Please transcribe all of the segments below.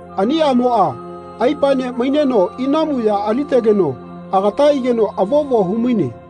Ani aꞌmoꞌa aipaene maineno inamu ya alitegeno agata aigeno avovo humaine.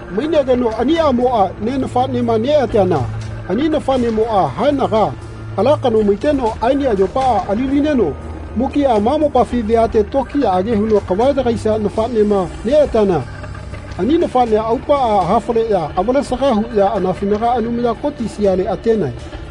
Mainegeno ani aꞌmoꞌa ne nafaꞌnema neꞌateana ani nafanemoꞌa haenaga ala kano maiteno aeni ayopaꞌa ali-lineno mukiꞌa ma mopafi veate tokiyaꞌage huno kava yagaisia nafaꞌnema neꞌateana ani nafaꞌnea aupaꞌa hafaleꞌya avalesaga huꞌya anafinaga Anumaya Koti siale atenae.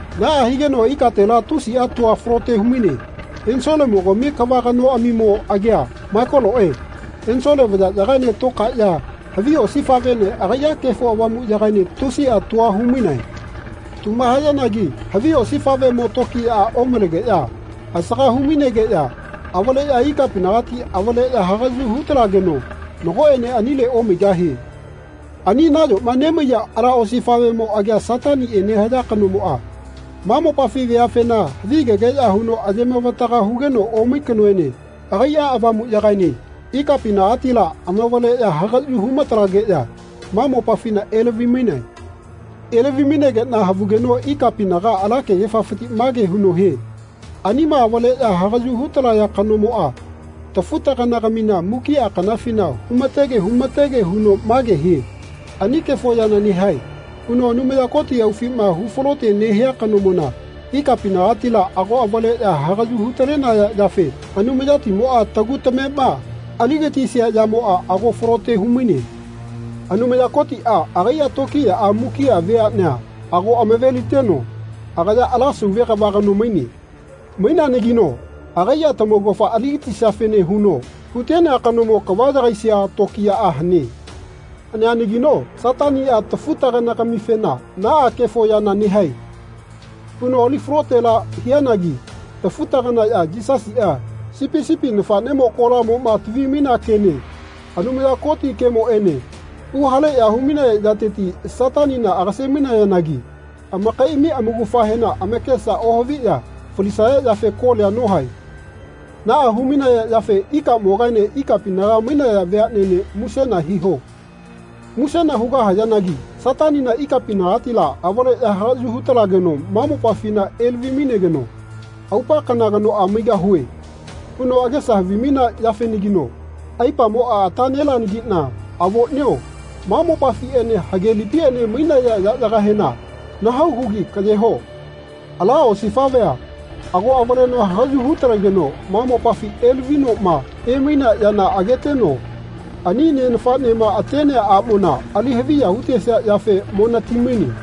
Naꞌa higeno ikatela tusiꞌa tua falote humaine. Ensolemo-gami kava kanoꞌamimo agia Maikoloe ensole vayaꞌyagaene tokaeꞌya havi osifaꞌvene agaiꞌa Kefo Avamuꞌyagaene tusiꞌa tua humainae. Tuma hayanagi havi osifaꞌvemo tokiyaꞌa omalegeꞌya asaga hu-mainageꞌya avaleꞌya ikapinagati avaleꞌya hagaꞌyu hu-talegeno nagoꞌene anile omaigahie. Ani nayoma nemaiya ala osifaꞌvemo agia Sataniꞌe nehaya kanomoꞌa ma mopafi veafena havigegeꞌya huno ayemavataga hugeno omai kanoene agaiꞌa avamuꞌyagaene ikapinagatila amavaleꞌya hagaꞌyu humatalageꞌya ma mopafina elavi-mainae. Elavi-mainageꞌna havugeno ikapinaga ala kegefafiti mage huno hie “Anima avaleꞌya hagaꞌyu hu-talaya kanomoꞌa tafu-tagana-gamina mukiꞌa kanafina humatege humatege huno mage hie ‘Ani kefo yana nehae.’ huno Anumaya Koti aufima hufalote nehia kanomona ikapinagatila ago avaleꞌya hagaꞌyu hu-talenaya yafe Anumayatimoꞌa tagu tamema aligatisia yamoꞌa ago falote humaine. Anumaya Kotiꞌa agaiꞌa tokiyaꞌa mukiꞌa veaꞌnea ago amave-liteno agaya ala sauve kava kano maine. Maineanagino agaiꞌa tamaugafa aligatisiafene huno hutenea kanomo kava yagaisia tokiyaꞌa hane. Haneanagino Sataniꞌa tafu-tagana-gamifena ‘Naꞌa kefo yana nehae.’ huno ali falotela hianagi tafu-taganaꞌya Yisasiꞌa, Sipi sipi nafaꞌnemo kolamoꞌma tavi-mainea kene Anumaya Koti kemoꞌene huhaleꞌya humainaya yateti Satanina agase-mainayanagi amakaiꞌami amaugafahena amakesa ohaviꞌya falisaya yafe kolia nohae. Naꞌa humainaya yafe ikamogaene ikapinaga mainaya veaꞌnene musena hiho. Musena hugahayanagi Satanina ikapinagatila avaleꞌya hagaꞌyu hu-talageno ma mopafina elavi-mainegeno ‘Aupa kana kanoꞌa maigahue.’ huno agesa havimainea yafenagino aipamoꞌa ata neleanagiꞌna avoꞌnio ma mopafiꞌene hagelipiꞌene mainaya yaꞌyagahena nahau hugi kaꞌyeho.” Ala osifaꞌvea ago avaleno hagaꞌyu hu-talegeno ma mopafi elavinoꞌma emainea yana ageteno ani ne nafaꞌnema atenea aꞌmona ali haviya hutesia yafe mo nati-maine.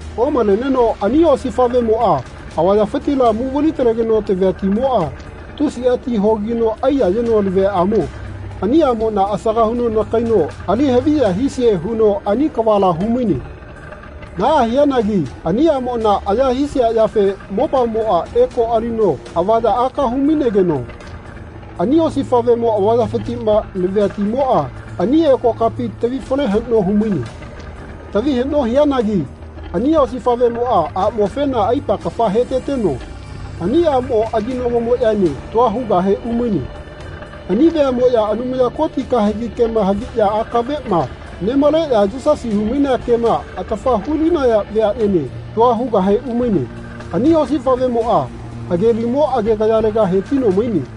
Omaleneno ani osifaꞌvemoꞌa avayafitila muvali-talegeno tavia timoꞌa tusiꞌa ti hogino aiyayeno laviaꞌamo ani aꞌmona asaga huno nakaino ali haviya hisie huno ani kavala humaine. Naꞌa hianagi ani aꞌmona aya hisia yafe mopamoꞌa eko alino avaya aka hu-mainegeno ani osifaꞌvemo avayafitiꞌma lavia timoꞌa ani eko kapi tavi fale haꞌno humaine. Tavi haꞌno hianagi ani osifaꞌvemoꞌa aꞌmofena aipa kafa heteteno ani aꞌmo aginagomoꞌyaene tua hugahe umaine. Ani veaꞌmoꞌya Anumaya Koti kahegi kema haviꞌya akaveꞌma nemaleꞌya Yisasi humainea kema atafa hu-linaya veaꞌnene tua hugahe umaine. Ani osifaꞌvemoꞌa hagelimo agegayalega hetino maine.